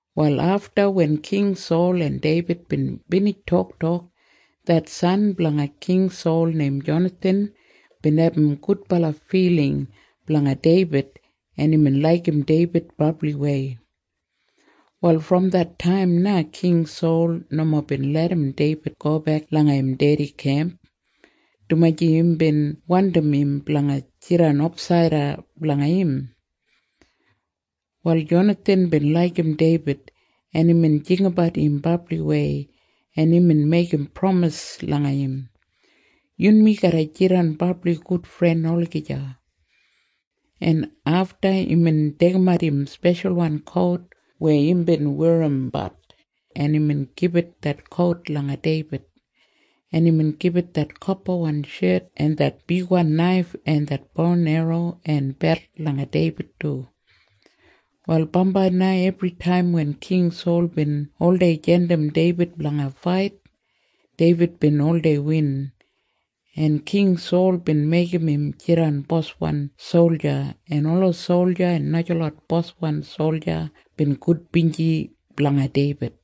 Wal afta wen King Sol en Deibid bin binij toktok, det san blanga King Sol neim Jonathan bin abum gudbala filing blanga Deibid, en imbin laigim Deibid brabliwei. Wal brom det taim na King Sol nomo bin larram Deibid gobek langa im dedi kemp, dumaji imbin wandim im blanga jidan ofsaida blanga im. Wal Jonathan bin laigim Deibid, en imbin jinggabat im brabliwei, en imbin meigim pramis langa im, “Yunmi garra jidan brabli gudfren olagija.” En afta imbin deigimat im speshalwan kout weya imbin werrimbat, en imbin gibit det kout langa Deibid, en imbin gibit det kopawan shet en det bigwan naif en det bo en erro en belt langa Deibid du. Wal bambai na ebritaim wen King Sol bin oldei jandim Deibid blanga fait, Deibid bin oldei win, en King Sol bin meigim im jidan boswan solja, en ola solja en najalot boswan solja bin gudbinji blanga Deibid.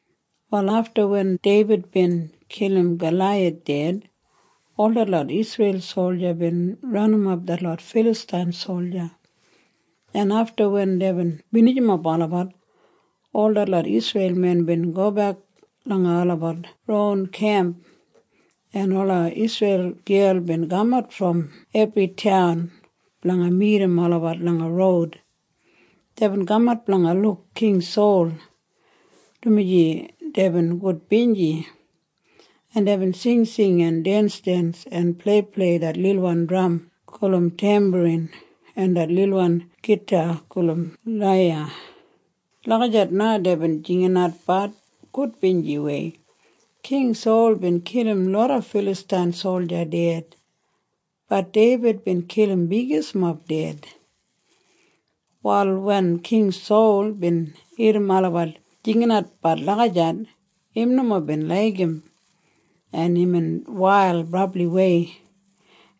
Wal afta wen Deibid bin kilim Galaiyath ded, ol detlot Isreil solja bin ranimap detlot Filastain solja, en afta wen deibin binijimap olabat, ol detlot Isreil men bin gobek langa olabat ron kemp, en ola Isreil gel bin kamat brom ebri taun blanga midim olabat langa roud. Deibin kamat blanga luk King Sol, dumaji deibin gudbinji, en deibin singsing en densdens en pleiplei det lilwan dram gulum tembarin en det lilwan gita gulum laiya. Lagijat na deibin jinginatbat gudbinjiwei, “King Sol bin kilim loda Filastain solja ded. Bat Deibid bin kilim bigismob ded.” Wal wen King Sol bin irrim olabat jinginatbat lagijat, im nomo bin laigim, en imbin wail brabliwei,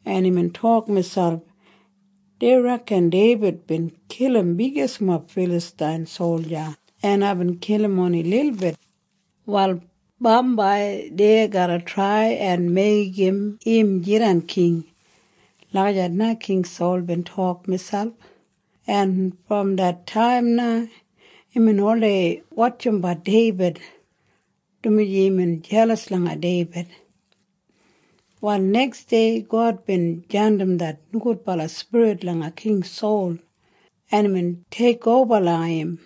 en imbin tok miselp, “Dei reken Deibid bin kilim bigismob Filastain solja en aibin kilim oni lilbit. Wal bambai dei garra trai en meigim im jidan king.” Lagijat na King Sol bin tok miselp, en brom det taim na imbin oldei wotjimbat Deibid, dumaji imbin jelas langa Deibid. Wal neksdei God bin jandim det nogudbala spirit langa King Sol, en imbin teikoba langa im,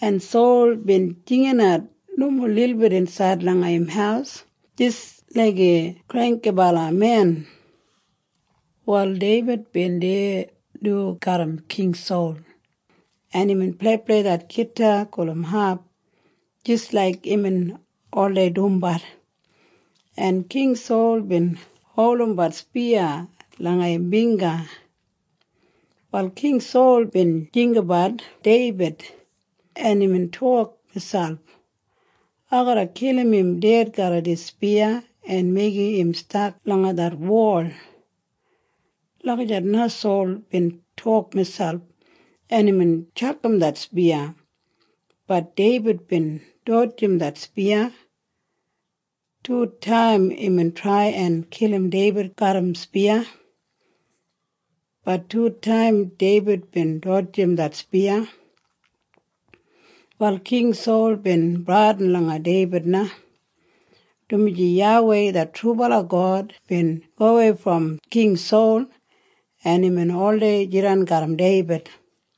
en Sol bin jinginat nomo lilbit insaid langa im haus jis laiga granggibala men. Wal Deibid bin deya du garram King Sol, en imbin pleiplei det gita gulum hap jis laik imbin oldei dumbat, en King Sol bin holdimbat spiya langa im bingga. Wal King Sol bin jinggabat Deibid, en imbin tok miselp, “Ai garra kilim im ded garram dis spiya en meigim im stak langa det wol.” Lagijat na Sol bin tok miselp, en imbin tjakam det spiya. Bat Deibid bin dodjim det spiya. Tutaim imbin trai en kilim Deibid garram spiya. Bat tutaim Deibid bin dodjim det spiya. Wal King Sol bin bradin langa Deibid na, dumaji YAWEI det trubala God bin gowei brom King Sol en imbin oldei jidan garram Deibid.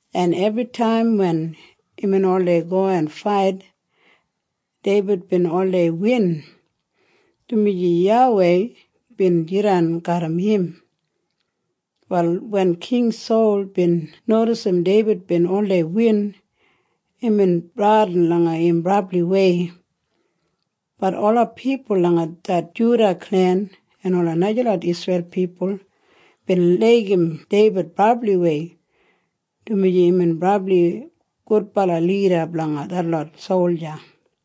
en ebritaim wen imbin oldei go en fait, Deibid bin oldei win, dumaji YAWEI bin jidan garram im. Wal wen King Sol bin nodisim Deibid bin oldei win, imbin bradin langa im brabliwei. Bat ola pipul langa det Juda klen en ola najalot Isreil pipul bin laigim Deibid brabliwei, dumaji imbin brabli gudbala lida blanga detlot solja.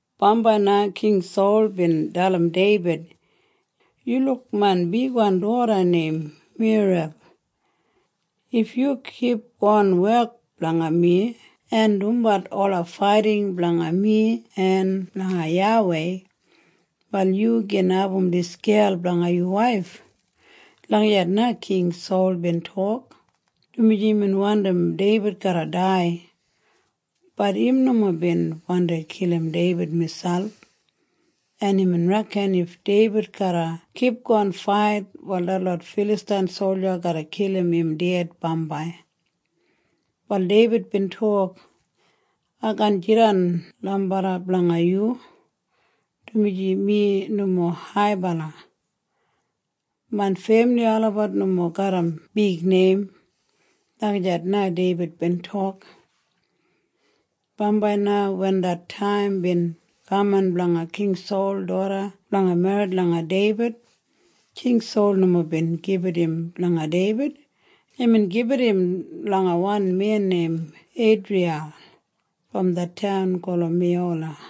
Bambai na King Sol bin dalim Deibid, “Yu luk main bigwan doda neim Merab. If yu kipgon wek blanga mi en dumbat ola faiting blanga mi en blanga YAWEI, wal yu gin abum dis gel blanga yu waif.” Lagijat na King Sol bin tok, dumaji imbin wandim Deibid garra dai. Bat im nomo bin wandi kilim Deibid miselp, en imbin reken if Deibid garra kipgon fait, wal detlot Filastain solja garra kilim im ded bambai. Wal Deibid bin tok, “Ai kaan jidan lambarra blanga yu, dumaji mi nomo haibala. Main femili olabat nomo garram bigneim.” Lagijat na Deibid bin tok. Bambai na wen det taim bin kaman blanga King Sol doda blanga merrit langa Deibid, King Sol nomo bin gibit im langa Deibid. Imbin gibit im langa wan men neim Eidriyal brom det taun gulum Mehola.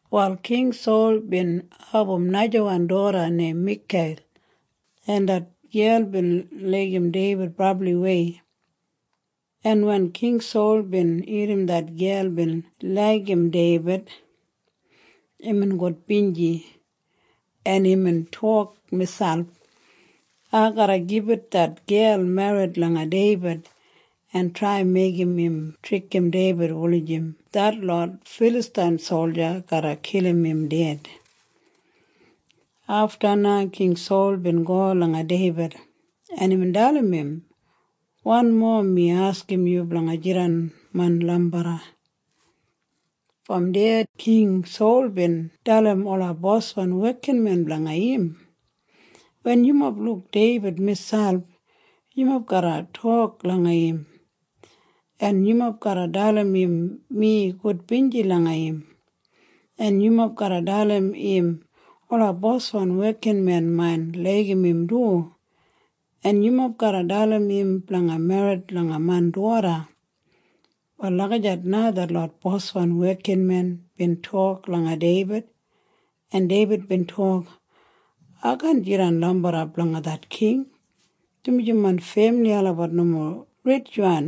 Wal King Sol bin abum najawan doda neim Mikal, en det gel bin laigim Deibid brabliwei, en wen King Sol bin irrim det gel bin laigim Deibid, imbin gudbinji, en imbin tok miselp, “Ai garra gibit det gel merrit langa Deibid en trai meigim im trikim Deibid wulijim detlot Filastain solja garra kilim im ded.” Afta na King Sol bin go langa Deibid, en imbin dalim im, “Wanmo mi askim yu blanga jidan main lambarra.” Brom deya King Sol bin dalim ola boswan wekinmen blanga im, “Wen yumob luk Deibid miselp, yumob garra tok langa im, en yumob garra dalim im mi gudbinji langa im, en yumob garra dalim im ola boswan wekinmen main laigim im du, en yumob garra dalim im blanga merrit langa main doda.” Wal lagijat na detlot boswan wekinmen bin tok langa Deibid, en Deibid bin tok, “Ai kaan jidan lambarra blanga det king, dumaji main femili olabat nomo ritjwan,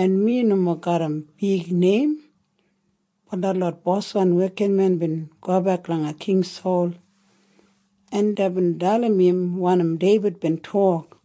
en mi nomo garram bigneim.” Wal detlot boswan wekinmen bin gobek langa King Sol, en deibin dalim im wanim Deibid bin tok,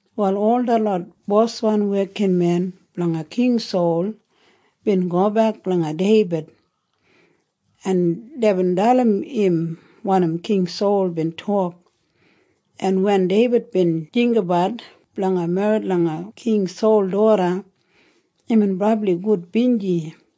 Wal ol detlot boswan wekinmen blanga King Sol bin gobek langa Deibid, en deibin dalim im wanim King Sol bin tok, en wen Deibid bin jinggabat blanga merrit langa King Sol doda, imbin brabli gudbinji,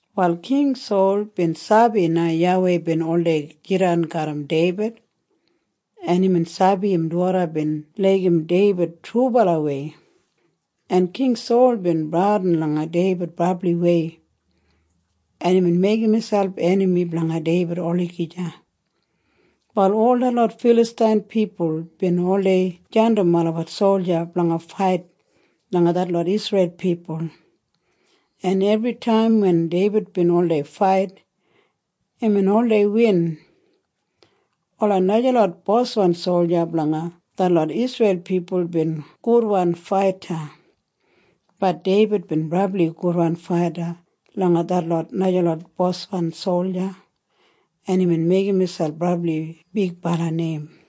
Wal King Sol bin sabi na YAWEI bin oldei jidan garram Deibid, en imbin sabi im doda bin laigim Deibid trubalawei, en King Sol bin bradin langa Deibid brabliwei, en imbin meigim miselp enami blanga Deibid olagija. Wal ol detlot Filastain pipul bin oldei jandim olabat solja blanga fait langa detlot Isreil pipul, en ebritaim wen Deibid bin oldei fait, imbin oldei win. Ola najalot boswan solja blanga detlot Isreil pipul bin gudwan faita. Bat Deibid bin brabli gudwan faita langa detlot najalot boswan solja, en imbin meigim miselp brabli bigbala neim.